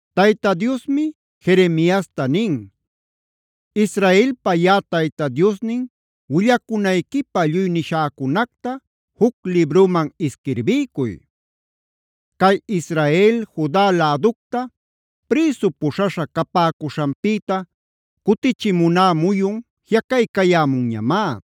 Tayta Diosmi Jeremiasta nin: “Israelpa yaꞌa Tayta Diosnin willacunayquipä lluy nishäcunacta juc libruman isquirbiycuy. Cay Israel, Juda läducta prïsu puśhaśha capäcuśhanpïta cutichimuná muyun jiꞌacaycayämunñamá.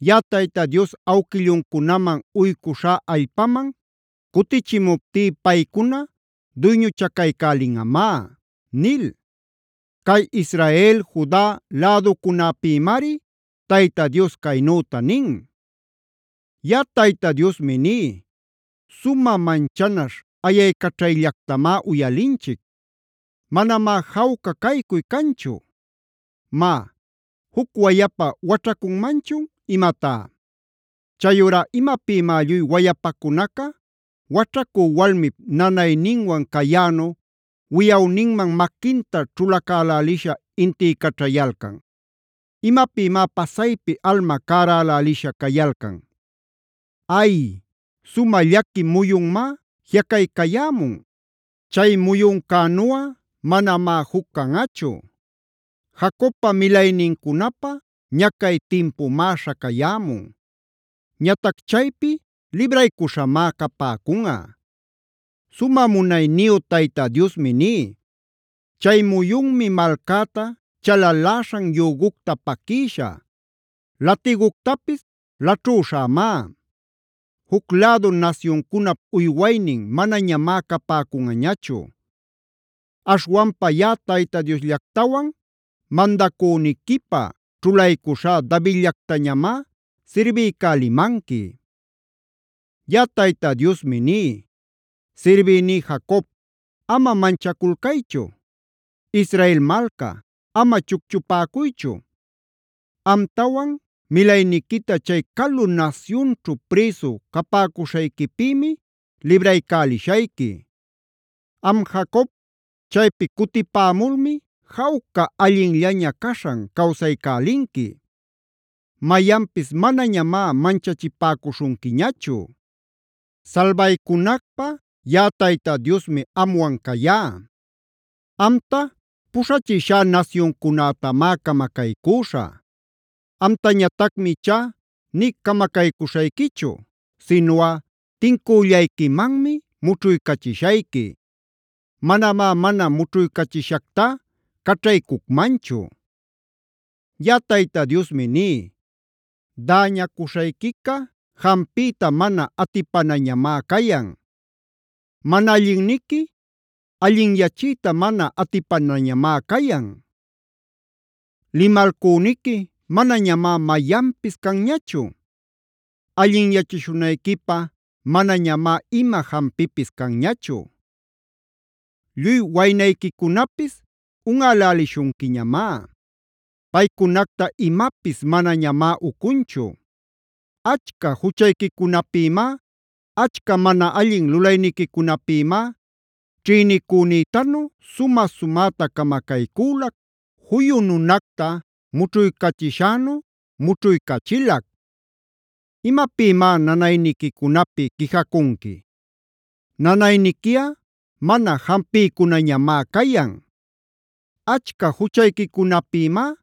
Yaꞌa Tayta Dios awquilluncunaman uycuśhá allpaman cutichimuptí paycuna duyñuchacaycälinꞌamá” nil. Cay Israel, Juda läducunäpïmari Tayta Dios caynüta nin: Yaꞌa Tayta Diosmi ní: Sumä manchanaśh ayaycaćhayllactamá uyalinchic. Manamá jawca caycuy canchu. Má, ¿juc wayapa waćhacunmanchun imatá? Chayurá ¿imapïmá lluy wayapacunaca waćhacü walmip nanayninwan cayänu wiyawninman maquinta ćhulacälälisha intiycaćhayalcan? ¿Imapïmá pasaypi alma cärälälisha cayalcan? Ay, sumä llaqui muyunmá jiꞌacaycayämun. Chay muyuncänuꞌa manamá juc canꞌachu. Jacobpa milaynincunapä ñacay timpumá śhacayämun. Ñatac chaypi libraycuśhamá capäcunꞌa. “Sumä munayniyu Tayta Diosmi ní: Chay muyunmi malcäta chalaläśhan yügucta paquïshä; latiguctapis laćhüśhämá. Juc lädu nasyuncunap uywaynin manañamá capäcunꞌañachu. Aśhwanpa yaꞌa Tayta Diosllactawan mandacüniquipä ćhulaycuśhá Davidllactañamá sirbiycälimanqui. “Yaꞌa Tayta Diosmi ní: Sirbïní Jacob, ama manchaculcaychu. Israel malca, ama chucchupäcuychu. Amtawan milayniquita chay calu nasyunćhu prïsu capäcuśhayquipïmia libraycälishayqui. Am Jacob, chaypi cutipämulmi jawca allinllaña caśhan cawsaycälinqui. Mayanpis manañamá manchachipäcuśhunquiñachu. Salbaycunacpä yaꞌa Tayta Diosmi amwan cayá. Amta puśhachishá nasyuncunätamá camacaycüśhä. Amtañatacmi ichá nï camacaycüśhayquichu, sinuꞌa tincüllayquimanmi mućhuycachishayqui. Manamá mana mućhuycachishactá caćhaycucmanchu. “Yaꞌa Tayta Diosmi ní: Däñacuśhayquica jampiyta mana atipanañamá cayan. Mana allinniqui allinyachiyta mana atipanañamá cayan. Limalcüniqui manañamá mayanpis canñachu. Allinyachishunayquipä manañamá ima jampipis canñachu. Lluy waynayquicunapis unꞌälälishunquiñamá. Paycunacta imapis manañamá ucunchu. Achca juchayquicunapïmá, achca mana allin lulayniquicunapïmá ćhïnicünïtanu sumä-sumäta camacaycülac, juyu nunacta mućhuycachishänu mućhuycachilac. ¿Imapïmá nanayniquicunapi quijacunqui? Nanayniquiꞌa mana jampiycunañamá cayan. Achca juchayquicunapïmá,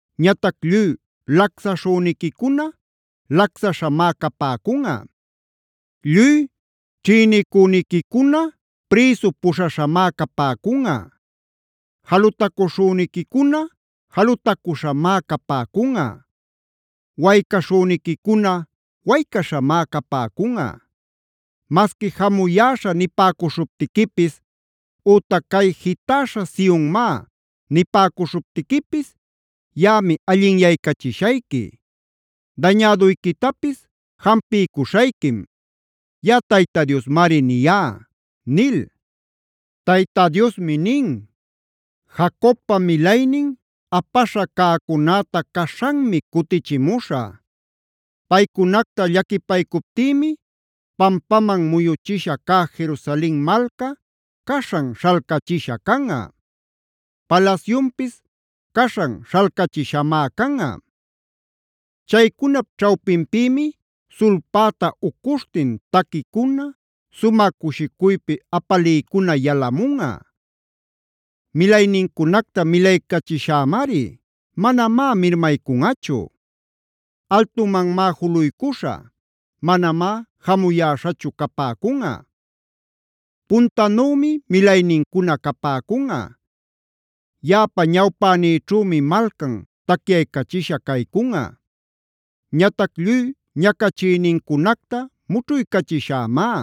“Ñatac lluy lacsaśhüniquicuna lacsaśhamá capäcunꞌa. Lluy ćhïnicüniquicuna prïsu puśhaśhamá capäcunꞌa. Jalutacuśhüniquicuna jalutacüśhamá capäcunꞌa. Waycaśhüniquicuna waycaśhamá capäcunꞌa. Masqui ‘jamuyäśha’ nipäcuśhuptiquipis ütac ‘cay jitäśha Sionmá’ nipäcuśhuptiquipis yaꞌami allinyaycachishayqui; dañäduyquitapis jampiycuśhayquim.c Yaꞌa Tayta Diosmari niyá” nil. Tayta Diosmi nin: “Jacobpa milaynin apaśha cäcunäta caśhanmi cutichimuśhä. Paycunacta llaquipaycuptïmi, pampaman muyuchisha cä Jerusalen malca, caśhan śhalcachisha canꞌa; palasyunpis caśhan śhalcachishamá canꞌa. Chaycunap ćhawpinpïmi sulpäta ucuśhtin taquicuna, sumä cushicuypi apaliycuna yalamunꞌa. Milaynincunacta milaycachishämari; manamá mirmaycunꞌachu. Altumanmá juluycuśhä; manamá jamuyäśhachu capäcunꞌa. Puntanümi milaynincuna capäcunꞌa. Yaꞌapa ñawpänïćhümi malcan tacyaycachisha caycunꞌa. Ñatac lluy ñacachïnincunacta mućhuycachishämá.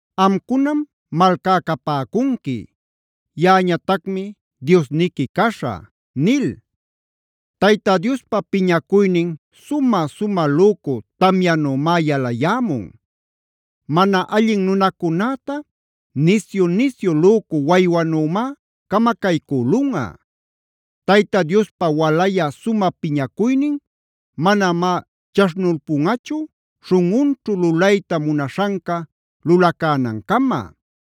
Amcunam malcá capäcunqui; yaꞌañatacmi Diosniqui caśhä” nil. Tayta Diospa piñacuynin sumä-sumä lücu tamyanümá yalayämun; mana allin nunacunäta nisyu-nisyu lücu waywanümá camacaycülunꞌa. Tayta Diospa walayä sumä piñacuynin manamá chaśhnulpunꞌachu, śhunꞌunćhu lulayta munaśhanca lulacänancama.